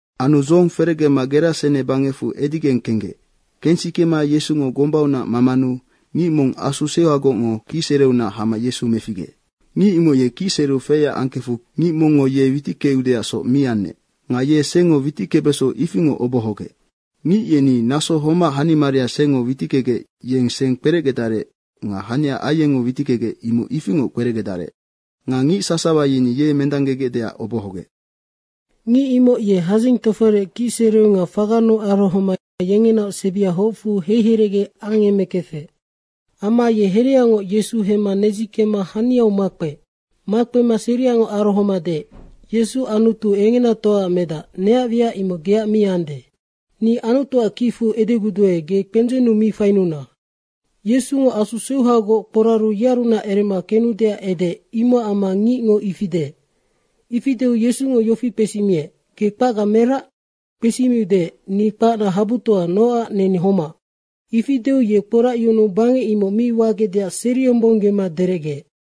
Anu dzohong ferecgema Gerasene bangecfu edigeng kenggec. Kensikema Yesungo gombaunac mamanu ngic mong asu seuhagocngo kicsereunac hama Yesu meficgeec. Ngic imoc ye kicsereu feyac angkefu ngic mongngo ye witickeudeacsoc mi anec. Nga yeni sengngo witickebeso ifingoc obohogec. Ngic yeni naso homac hanimaria sengngo witickegec yeng seng kperecgedarec nga hania aiengngo witickegec, imoc ifingoc kperecgedarec. Nga ngic sasawa yeni ye mendanggegecdeac obohogec. Ngic imoc ye hadzing toforec kicsereu nga fagannu arohoma yengenaoc sebia hocfu heiherecge angemekefec. Amma ye hereaungoc Yesu hemma nedzikemma haniau makpeec. Makpema seriangoc arohoma deec, “Yesu Anutu engenatoaac Medac, neac wiac imoc geac mi ande. Ni Anutuac kicfu edeguduae, ge kpendzennu mi fainuna.” Yesungo asu seuhagoc kporaru yearunac erema kenudeac edeec, imocac amma ngicngo ifi deec. Ifi deu Yesungo yofi kpesimiec, “Ge kpacga merac?” kpesimiu deec, “Ni kpacna habutoa, nocac neni homac.” Ifi deu ye kporacyunuu bangec imoc mi wagecdeac seriyombonggema derecgeec.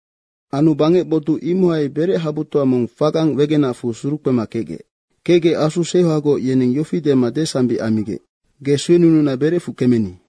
Anu bangec botuc imohai berechabutoa mong fagang wegenacfu surukpema kecgec. Kecgec asu seuhagoc yeneng yofi dema desambic ammigec, “Ge suenununa berecfu kemeni.”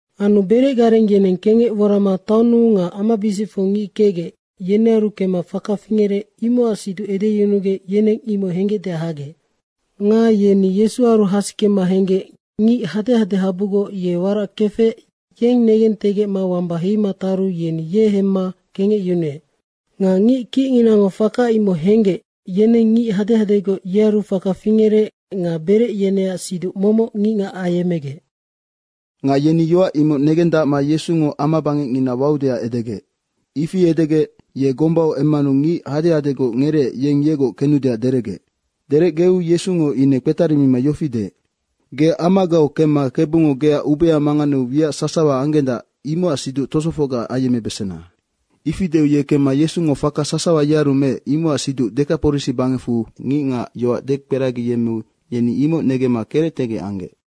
Anu berecgareng yeneng kengec worama taonnu nga amabisicfu ngic kecgec, yenearu kemma faka fingerec, imocac siduc edeyunugec yeneng imoc hengecdeac hagec. Nga yeni Yesuaru hasikema henggec ngic hadehadehabugoc warac kefec, yeng negentegecma wamba heima taru yeni ye hemma kengecyunuec. Nga ngic kicnginango faka imoc henggec, yeneng ngic hadehadegoc, yearu faka fingerec nga berec yeneac siduc momoc ngicngac ayemmegec. Nga yeni yoac imoc negendacma Yesungo amabangecngina waudeac edegec. Ifi edegec ye gombau emmanu ngic hadehadegoc ngereec, yeng yegoc kenudeac derecgeec. Derecgeu Yesungo ine kpetarimima yofi deec, “Ge amagau kemma Kebungo geac ubea manganeu wiac sasawa anggendac, imocac siduc tosofocga ayemmebesena.” Ifi deu ye kemma Yesungo faka sasawa yearu meec, imocac siduc Dekaporisi bangecfu ngicngac yoac dekperagiyemmeu yeni imoc negemma kerectegec anggec.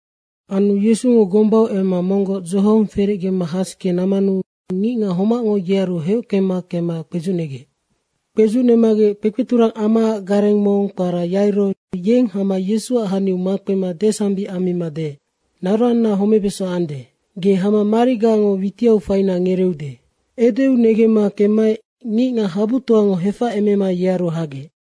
Anu Yesungo gombau emma monggoc dzohong ferecgema hasike nammanu ngicngac homacngo yearu heockema kemma kpedzucnegec. Kpedzucnemagec kpekpeturang amaac gareng mong kpara Yairo, yeng hama Yesuac haniau makpema desambic amma deec, “Naroanna homebeso ande. Ge hama marigango witiau faina ngereeude.” Edeu negemma kemmaec ngicngac habutoango hefacemema yearu hagec.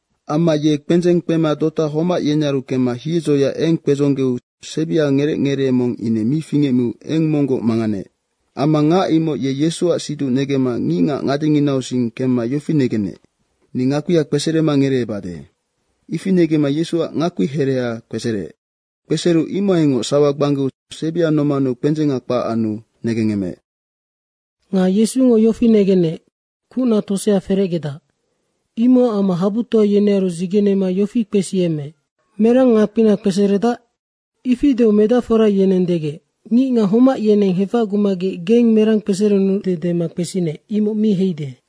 Amma ye kpendzeng kpema dota homac yenearu kemma hiedzoya eng kpedzonggeu sebiau ngerec ngeree mong ine mi fingecmiu eng monggoc manganeec. Amma ngac imoc ye Yesuac siduc negemma ngicngac ngadenginausing kemma yofi negenec, “Ni ngakpia kpeserema ngereebadenoc.” ifi negemma Yesuac ngakpihereha kpesereec. Kpesereu imohaingoc sawa gbanggeu sebia nomaneu kpendzenga kpac anu negengemeec. Nga Yesungo yofi negenec, kucna tosea ferecgedac, imocac amma habutoa yenearu dzigenema yofi kpesiyemmeec, “Merang ngakpina kpeseredac?” Ifi deu medacfora yeneng degec, “Ngicngac homac yeneng hefacgumagec geng merang kpeserenude dema kpesinec, imoc mi heide.”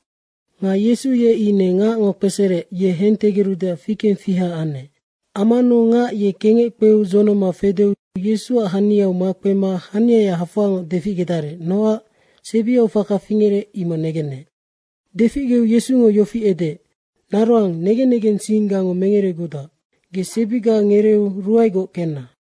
Nga Yesu ye ine ngacngo kpesereec, ye hentegerudeac fikengfiha anec. Ammanu ngac ye kengec kpeu dzonoma fedeu Yesuac haniau makpema haniaya hafoangoc deficgedarec, nocac sebiau faka fingerec, imoc negenec. Deficgeu Yesungo yofi edeec, “Naroang, negen negensinggango mengeregudac. Ge sebiga ngereeu ruaegoc kenna!”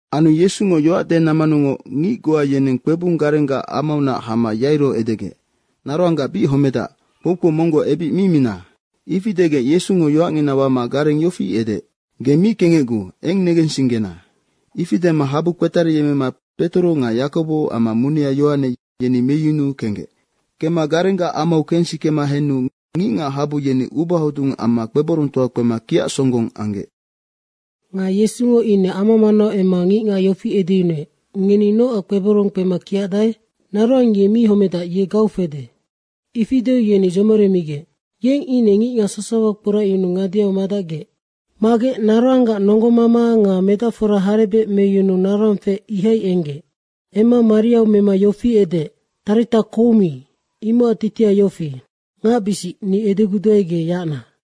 Anu Yesungo yoac denammanungoc ngic goa yeneng kpebung garenggac amaunac hama Yairo edegec, “Naroangga bic homedac, kpoukpou monggoc ebic mi mina!” Ifi degec Yesungo yoacngina wama gareng yofi edeec, “Ge mi kengecguu, eng negensinggena.” Ifi dema habu kpetariyemmema Petoro nga Yakobo amma munea Yohane, yeni meyunuu kenggec. Kemma garenggac amau kensikema henu ngicngac habu yeni ubahodung amma kpeborongtoa kpema kiacsonggong anggec. Nga Yesungo ine ama manau emma ngicngac yofi edeyunuec, “Ngeni nocac kpeborong kpema kiacdae? Naroang ye mi homedac, ye gau fede.” ifi deu yeni dzomoremigec. Yeng ine ngicngac sasawa kporacyunuu ngadeau madacgec. Magec naroanggac nonggomama nga medacfora harebec meyunuu naroang feec, ihai enggec. Emma mariau mema yofi edeec, “Tarita koumi!” imocac titiha yofi, “Ngacbisic, ni edeguduae, ge yacna.”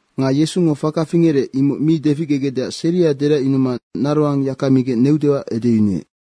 Nga Yesungo faka fingerec, imoc mi deficgegecdeac seria deracyunuma naroang yaka migec neudeac edeyunuec.